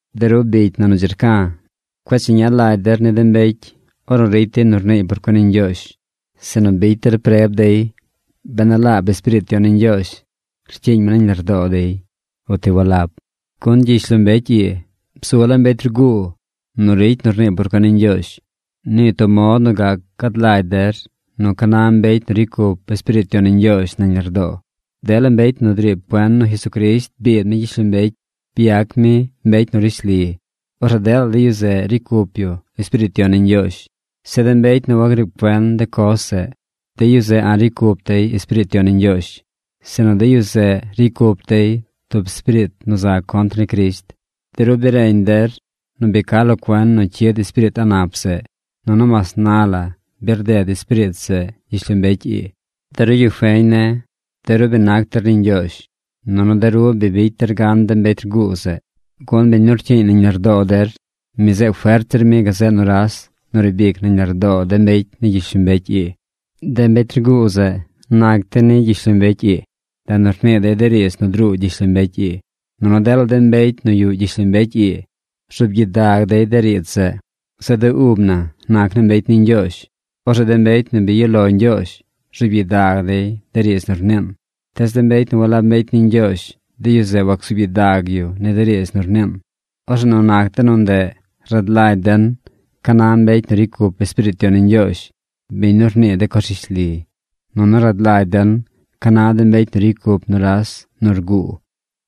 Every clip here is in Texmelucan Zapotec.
De ru bicy na nu dzi rca̱, cueꞌ cheña lagy der ni de mbecy ornu ricy dey nu rniiy por cuen ni Ñgyoozh, sinu bicy der preb dey ben a laab Espiriit Yon ni Ñgyoozh rcyiiñ mi nañ lardoo dey, uti walab. Gun gyishlombecy ii bzu laa mbecy rguu nu ricy nu rnii por cuen ni Ñgyoozh. Nii tub mod nu gac gad lagy der nu ca na mbecy nu ricy cup Espiriit Yon ni Ñgyoozh nañ lardoo: dela mbecy nu driib cuen nu Jesucrisht biid mi gyishlombecy byac mi mbecy nu rishli, orzeꞌ dela de yu zeꞌ ricy cup yu Espiriit Yon ni Ñgyoozh. Zeꞌ de mbecy nu wagriib cuen de coz zeꞌ, de yu zeꞌ a̱ꞌ ricy cup dey Espiriit Yon ni Ñgyoozh, sinu de yu zeꞌ ricy cup dey tub espiriit nu za contr ni Crisht. De ru bi reñ der nu bi ca lo cuen nu cyid espiriit a̱ꞌ nap zeꞌ. Nunu mas na la bi rded espiriit zeꞌ gyishlombecy ii. De ru yu feñ ne̱, de ru bi nac der ni Ñgyoozh. Nunu de ru bi bicy der gan de mbecy rguu zeꞌ. Gun biñ nu rcyiiñ nañ lardoo der, mi zeꞌ fert zir mi gazeꞌ nuras nu riib ic nañ lardoo de mbecy ni gyishlombecy ii. De mbecy rguu zeꞌ nac dey ni gyishlombecy ii. Ndeꞌ nu rnii dey de riidz nu druu gyishlombecy ii. Nunu dela de mbecy nu yuꞌ gyishlombecy ii rzuub gyidag dey de riidz zeꞌ. Zeꞌ de ub na nac naa mbecy ni Ñgyoozh. Orzeꞌ de mbecy nu bi yuꞌ lo Ñgyoozh rzuub gyidag dey de riidz nu rniin. Tees de mbecy nu walab mbecy ni Ñgyoozh, de yu zeꞌ wacsuub gyidag yu ni de riidz nu rniin. Orzeꞌ nu nac de nu ndeꞌ rad lagy den ca na mbecy nu ricy cup Espiriit Yon ni Ñgyoozh, biñ nu rnii de coz rishli, nunu rad lagy den ca na de mbecy nu ricy cup nuras nu rguu.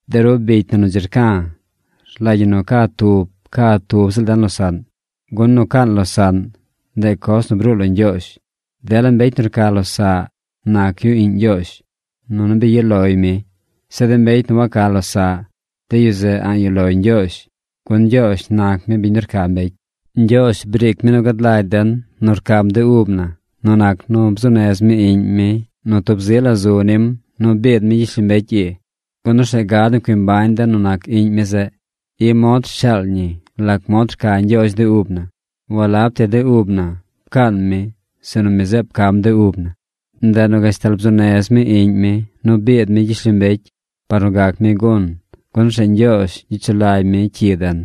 De ru bicy na nu dzi rca̱, rlagy ñi nu ca tub ca tub ziꞌl den losaꞌn. Gun nu caan losaꞌn, ndeꞌ coz nu bruu lo Ñgyoozh. Dela mbecy nu rca losaꞌ nac yu iꞌñ Ñgyoozh, nunu bi yuꞌ loy mi. Zeꞌ de mbecy nu waca losaꞌ, de yu zeꞌ a̱ꞌ yuꞌ loy Ñgyoozh, gun Ñgyoozh nac mi biñ nu rca mbecy. Ñgyoozh briic mi nu gad lagy den nu rcam de ub na nu nac nu bzuu nez mi Iꞌñ mi nu tub zi la zu nim nu biid mi gyishlombecy ii, gun orzeꞌ gad nu cui mbañ den nu nac Iꞌñ mi zeꞌ. I mod rshaal ñi lac mod rca Ñgyoozh de ub na: walab ti de ub na pcaan mi, sinu mi zeꞌ pcam de ub na. Ndeꞌ nu gashtal bzuu nez mi Iꞌñ mi nu biid mi gyishlombecy par nu gac mi gun, gun orzeꞌ Ñgyoozh gyicy sulagy mi cyi den.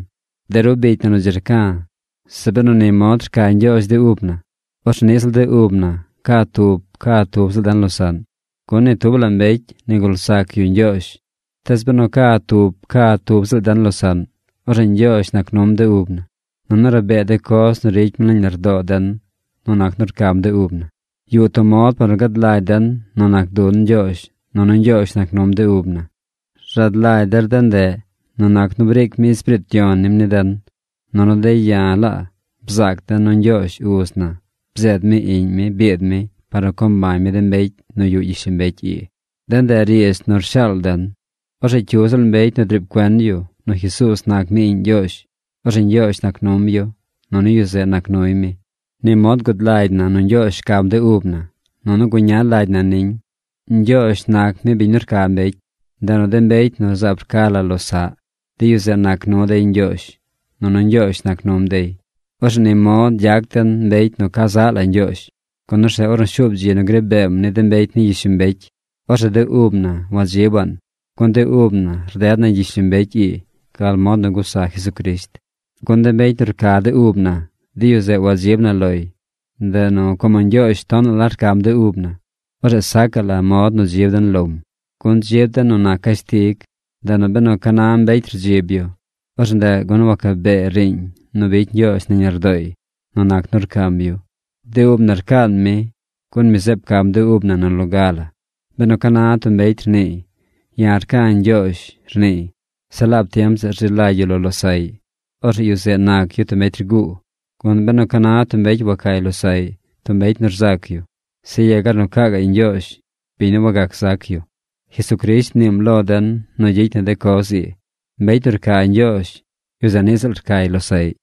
De ru bicy na nu dzi rca̱, zeꞌ benu ni mod rca Ñgyoozh de ub na, orzeꞌ niꞌ ziꞌl de ub na ca tub ca tub ziꞌl den losaꞌn. Gun ni tub la mbecy nigul zac yu Ñgyoozh. Tees benu ca tub ca tub ziꞌl den losaꞌn, orzeꞌ Ñgyoozh nac num de ub na, nunu rabee de coz nu ricy mi nañ lardoo den nu nac nu rcam de ub na. Yuꞌ tub mod par nu gad lagy den nu nac dun Ñgyoozh nunu Ñgyoozh nac num de ub na. Rad lagy der de ndeꞌ nu nac nu briic mi Espiriit Yon nim ni den. Nunu de̱ ya̱ laa bzaac de̱ nu Ñgyoozh Uz na bzeed mi Iꞌñ mi biid mi par nu co mbañ mi de mbecy nu yuꞌ gyishlombecy ii. De ndeꞌ riidz nu rshaal den. Orzeꞌ cyu ziꞌl mbecy nu driib cuen yu nu Jesuuz nac mi Iꞌñ Ñgyoozh, orzeꞌ Ñgyoozh nac num yu, nunu yu zeꞌ nac nuy mi. Ni mod gud lagy na nu Ñgyoozh rcam de ub na nunu guña lagy na niñ. Ñgyoozh nac mi biñ nu rca mbecy. Ndeꞌ nu de mbecy nu zaab rca la losaꞌ, de yu zeꞌ nac nu dey Ñgyoozh, nunu Ñgyoozh nac num dey. Orzeꞌ ni mod gyac den mbecy nu ca zaꞌ la Ñgyoozh, gun orzeꞌ ornu shuub dzi nu gri beem ni de mbecy ni gyishlombecy, orzeꞌ de ub na wadzibaꞌn, gun de ub na rded na gyishlombecy ii gal mod nu gusa Jesucrisht. Gun de mbecy nu rca de ub na, de yu zeꞌ wadzib na loy. Ndeꞌ nu, como Ñgyoozh tonaꞌ rcam de ub na, orzeꞌ sacaꞌ la mod nu dzib den lom. Gun dzib den nu nac cashtig. Ndeꞌ nu benu ca na mbecy rdzib yu, orzeꞌ ndeꞌ gun wacabee riiñ nu bicy Ñgyoozh nañ lardooy nu nac nu rcam yu. De ub na rcaan mi, gun mi zeꞌ pcam de ub na nu loga la. Benu ca na tub mbecy rniiy: “Ya̱ rca̱ Ñgyoozh”, rniiy, zeꞌ laab tiem zeꞌ rzi lagy yu lo losaꞌy, orzeꞌ yu zeꞌ nac yu tub mbecy rguu. Gun benu ca na tub mbecy wacay losaꞌy, tub mbecy nu rzac yu, zeꞌ yegar nu caa gaꞌy Ñgyoozh, biñ nu wagac zac yu. Jesucrisht mniim lo den nu gyicy na de coz ii: mbecy nu rca Ñgyoozh, yu zeꞌ niꞌ ziꞌl rcay losaꞌy.